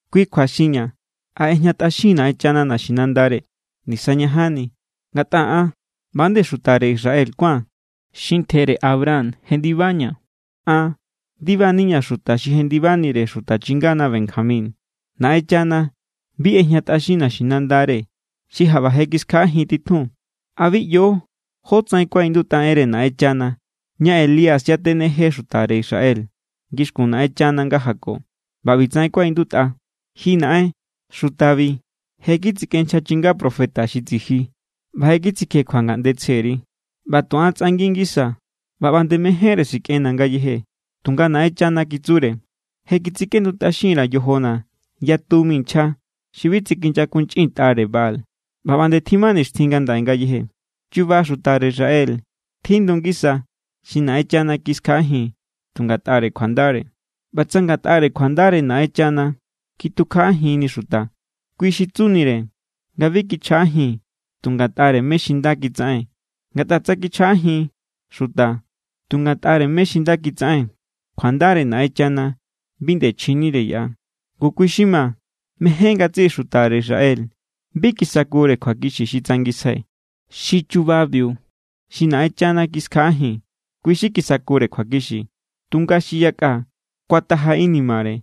Kui kjua xinña̱, ¿a ꞌejñatꞌaxin= Naꞌenchana naxinandare? ¡Nisañajanni! Ngatꞌa an ꞌba=nde xutare Israel kuáa̱n xi ntjere Abraham jendibaña̱. An ndibaniña̱ xuta xi jendibanire xuta chingana Benjamín. Naꞌenchana bi ꞌejñatꞌaxin naxinandare xi jaꞌba je kiskjaꞌajin titjun. ¿A bi ꞌyo jótsaꞌen kuaꞌindutꞌa enre Naꞌenchana, ña Elías yatejene xutare Israel ngixkun Naꞌenchana nga jako? ꞌBa ꞌbi=tsaꞌen kuaꞌindutꞌa: “Ji Naꞌen, xutabi je= kitsikꞌen nchja chinga profeta xi tsiji ꞌba je kitsikjekjua ngaꞌnde tsjeri. ꞌBa tu an tsꞌangi ngisaa̱, ꞌba ꞌba nde mejénre sikꞌenna̱ ngayeje.” Tunga Naꞌenchana kitsure: “Je kitsikꞌendutꞌaxin_ra̱ yojona̱ yatu mi nchja xi bi tsikinyakunchꞌintꞌare Baal.” ꞌBa ꞌba nde tjima nixtjin ngandaꞌe ngayeje. Chuba xutare Israel tjindu ngisa xi Naꞌenchana kiskjaꞌajin tu ngatꞌare kjuandare. ꞌBa tsa ngatꞌare kjuandare Naꞌenchana kitukjaꞌajinni xuta, kui xi tsunire nga bi kichjaꞌajin tu ngatꞌare mé= xi nda kitsaꞌen. Ngatꞌa tsa kichjaꞌajin xuta tu ngatꞌare mé= xi nda kitsaꞌen, kjuandare Naꞌenchana bi nde chjinire yaꞌa. Ngu, kui= xi ma. Mejen ngatsiꞌi xutare Israel bi kisakure kjuakixi xi tsangisjai. Xi chubabiu xi Naꞌenchana kiskjaꞌajin, kui= xi kisakure kjuakixi. Tunga xi yakꞌa kuataja inimare.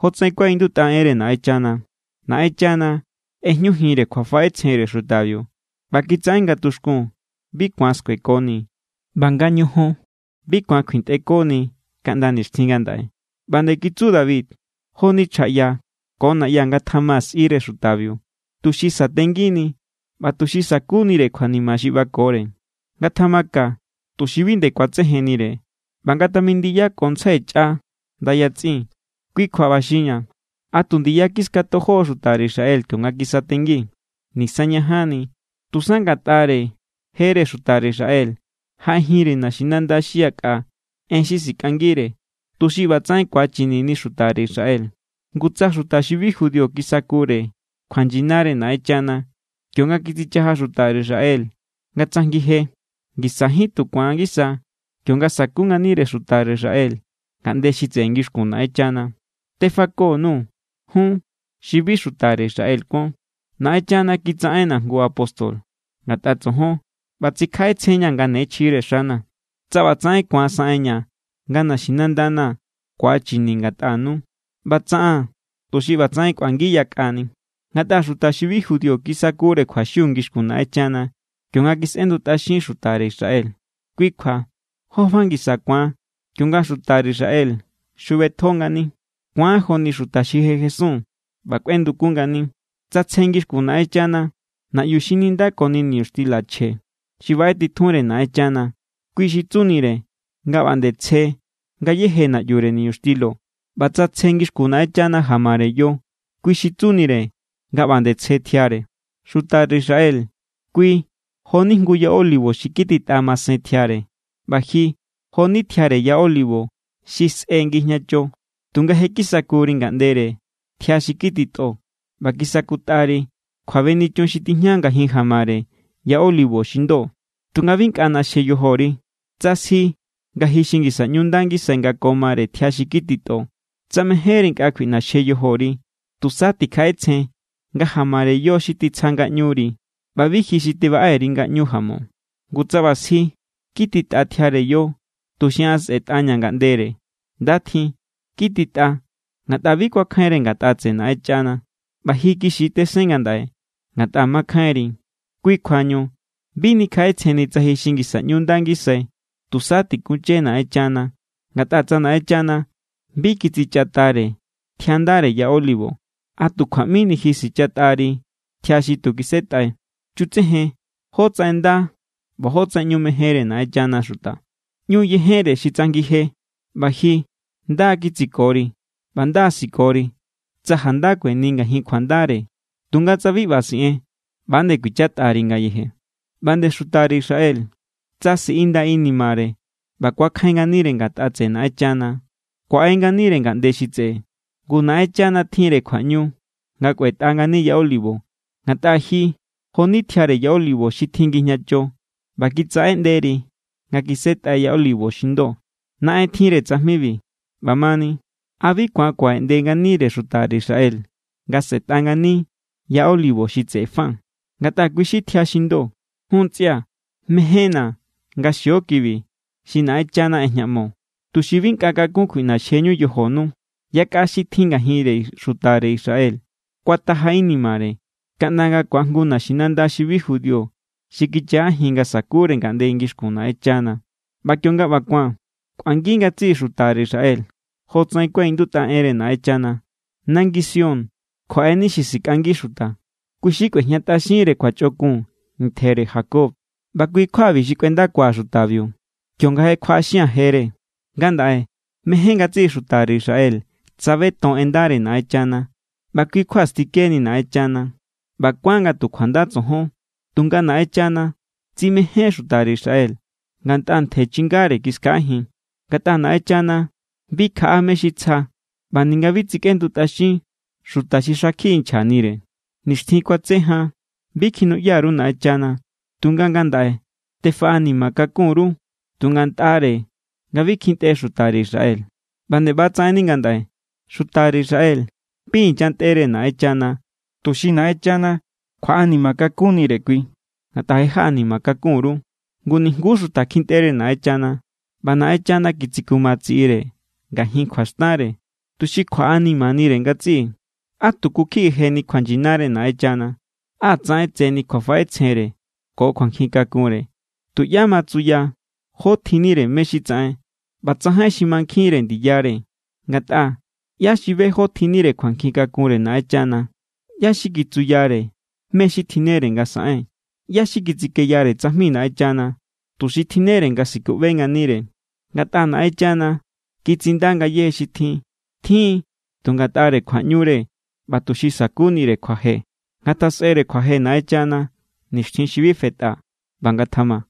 Jotsaꞌen kuaꞌindutꞌa enre Naꞌenchana: “Naꞌenchana ꞌejñujinre kjuafaꞌetsjenre xutabiu ꞌba kitsaꞌen nga tuxkun bi ku̱an skuekoni ꞌba nga ñojon bi ku̱an kjuintꞌekoni kaꞌnda nixtjin ngandaꞌe.” ꞌBa nde kitsu David: Joni chjaꞌya ko na̱ꞌya ngatjama sꞌire xutabiu, tuxi satengini ꞌba tuxi sa̱kunire kjuanima xi ꞌbakore. Ngatjama ka tuxi bi nde ku̱atsejennire, ꞌba ngatamindiyakontsjai chꞌa ndayatsꞌin. Kui kjua ꞌba xinña̱, ¿a tu ndiya kiskatojo= xutare Israel kionga kisatengi? ¡Nisañajanni! Tusa ngatꞌare jere xutare Israel jaꞌejinre naxinanda xi yakꞌa en xi sikꞌangire, tuxi ꞌbatsaꞌen ku̱achinini xutare Israel. Ngu tsa xuta xi bi judío kisakure kjuanyinare Naꞌenchana kionga kitsichaja xutare Israel nga tsajngi je, ngisajín tu ku̱an ngisa kionga sa̱ku nganire xutare Israel ngaꞌnde xi tseꞌe ngixkun Naꞌenchana. Tefako_nuu̱ jun xi bi xutare Israel kuon. Naꞌenchana kitsaꞌenna̱ jngu apóstol ngatꞌa tsojon ꞌba tsikjaꞌetsjenñaa̱ nga ne chjire xana̱. Tsa ꞌbatsaꞌen ku̱an saꞌenña̱ nga naxinandana̱ ku̱achini ngatꞌanu, ꞌba tsaꞌaa̱n tuxi ꞌbatsaꞌen kꞌuangi yakꞌani. Ngatꞌa xuta xi bi judío kisakure kjuaxiu ngixkun Naꞌenchana kionga kisꞌendutꞌaxin xutare Israel. Kui kjua, ¿jó fa ngisa ku̱an kionga xutare Israel xjubetjo ngani? Ku̱an joni xuta xi je jesun ꞌba kꞌuendukun ngani. Tsa tsje ngixkun Naꞌenchana naꞌyu xi nindako niñuxtila chje xi baꞌetitjunre Naꞌenchana, kui xi tsunire nga ꞌba=nde tsje ngayéje naꞌyure niñuxtilo. ꞌBa tsa tsje ngixkun Naꞌenchana jamare yo, kui xi tsunire nga ꞌba nde tsje tjiare. Xutare Israel, kui jo=ni jngu ya olivo xi kititꞌa masen tjiare. ꞌBa ji jo=ni tjiare ya olivo xi sꞌe ngijñacho. Tunga je= kisakuri ngaꞌndere tjia xi kititꞌo ꞌba kisakutꞌari kjuabenichun xi tijña ngajin jamare ya olivo xi ndo. Tunga bi nkꞌa ꞌnaxje yojori, tsa sji nga ji xi ngisa ꞌñu nda ngisai nga ko mare tjia xi kititꞌo. Tsa mejénri nkꞌa kjuiꞌnaxje yojori, tusa tikjaꞌetsjen nga jamare yo xi tsja ngaꞌñuri ꞌba bi ji xi baꞌe_ri ngaꞌñu jamo. Ngu tsa ꞌba sji: “Kititꞌa tjiare yo, tuxi an sꞌetꞌaña̱ ngaꞌndere.” Nda tjin. Kititꞌa ngatꞌa bi kuakjainre ngatꞌa tseꞌe Naꞌenchana. ꞌBa ji kixi tesen ngandaꞌe ngatꞌa mankjainri. Kui kjuañu bi nikjaꞌetsjenni tsa ji xi ngisa ꞌñu nda ngisai. Tusa tikunche Naꞌenchana. Ngatꞌa tsa Naꞌenchana bi kitsichatꞌare tjia ndare ya olivo, ¿a tu kjua ꞌmini ji sichatꞌari tjia xi tu kisetꞌai? Chutsejen jótsaꞌen nda ꞌba jótsaꞌen ꞌñu mejenre Naꞌenchana xuta. ꞌÑu yejenre xi tsajngi je ꞌba ji nda= kitsikori. ꞌBa nda= sikori, tsa janda kueni ngajin kjuandare. Tunga tsa bi ꞌba siꞌen, ꞌba=nde kuichatꞌari ngayeje. ꞌBa nde xutare Israel, tsa siꞌinda inimare ꞌba ku̱akjain nganire ngatꞌa tseꞌe Naꞌenchana, kuaꞌe nganire ngaꞌnde xi tseꞌe. Ngu Naꞌenchana tjinre kjuaꞌñu nga kꞌuetꞌa ngani ya olivo. Ngatꞌa ji jo=ni tjiare ya olivo xi tjin ngijñacho ꞌba kitsaꞌeꞌnderi nga kisetꞌai ya olivo xi ndo. Naꞌen tjinre tsajmibiu. ꞌBamani, ¿a bi ku̱an kuaꞌeꞌnde nganire xutare Israel nga sꞌetꞌa ngani ya olivo xi tseꞌe fa? Ngatꞌa kui= xi tjia xi ndo. Jun ntsꞌia̱, mejénna̱ nga xio kibi xi Naꞌenchana ꞌejñaꞌmo, tuxi bi nkꞌa kakun kjuiꞌnaxjeñu yojonu. Yakꞌa xi tjin ngajinre xutare Israel kuataja inimare kaꞌnda nga ku̱ajngu naxinanda xi bi judío xi kichjaꞌajin nga sa̱kure ngaꞌnde ngixkun Naꞌenchana. ꞌBa kionga ꞌba ku̱an, kꞌuangi ngatsiꞌi xutare Israel. Jotsaꞌen kuaꞌindutꞌa enre Naꞌenchana: Nangi Sión kjuaꞌeni xi sikꞌangi xuta. Kui= xi kꞌuejñatꞌaxinre kjuachꞌokun ntjere Jacob. ꞌBa kui= kjuabi xi kꞌuendakua̱ xutabiu, kionga je kjuaꞌaxia̱n jere. Ngandaꞌe mején ngatsiꞌi xutare Israel tsabeton en ndare Naꞌenchana ꞌba kui= kjua stikeni Naꞌenchana. ꞌBa kuán nga tu kjuanda tsojon. Tunga Naꞌenchana tsimején xutare Israel ngatꞌa ntje chingare= kiskjaꞌajin. Ngatꞌa Naꞌenchana bi kjaꞌa mé= xi tsja ꞌba ninga bi tsikꞌendutꞌaxin xuta xi xakjiꞌi nchjanire. Nixtjin kuatse jan bi kjinuꞌya_ru Naꞌenchana, tunga ngandaꞌe tefaꞌanima kakun_ru tu ngatꞌare nga bi kjintꞌe xutare Israel. ꞌBa nde ꞌbatsaꞌenni ngandaꞌe. Xutare Israel bi inyantꞌere Naꞌenchana tuxi Naꞌenchana kjuaꞌanima kakunnire kui ngatꞌa je jaꞌanima kakun_ru. Ngu nijnguú xuta kjintꞌere Naꞌenchana, ꞌba Naꞌenchana kitsikuma tsiꞌire ngajin kjuaxtanre tuxi kjuaꞌanimanire ngatsiꞌi. ¡Á tuku kjiꞌi jeni kjuanyinare Naꞌenchana! ¡Á tsaꞌen tseni kjuafaꞌetsjenre ko kjuankjin kakunre! Tuꞌyá ma tsuya jó tjinnire mé= xi tsaꞌen. ꞌBa tsajain xi mankjinre ndiyare. Ngatꞌa, ¿ꞌyá xi be jó tjinnire kjuankjin kakunre Naꞌenchana? ¿ꞌYá= xi kitsuyare mé= xi tjinnere nga saꞌen? ¿ꞌYá= xi kitsikeyare tsajmi Naꞌenchana, tuxi tjinnere nga sikuꞌbe nganire? Ngatꞌa Naꞌenchana kitsinda ngayéje xi tjin. Tjin= tu ngatꞌare kjuaꞌñure ꞌba tuxi sa̱kunire kjuaje. ¡Ngatjasꞌere kjuaje Naꞌenchana nixtjin xi bi fetꞌa! ꞌBa ngatjama.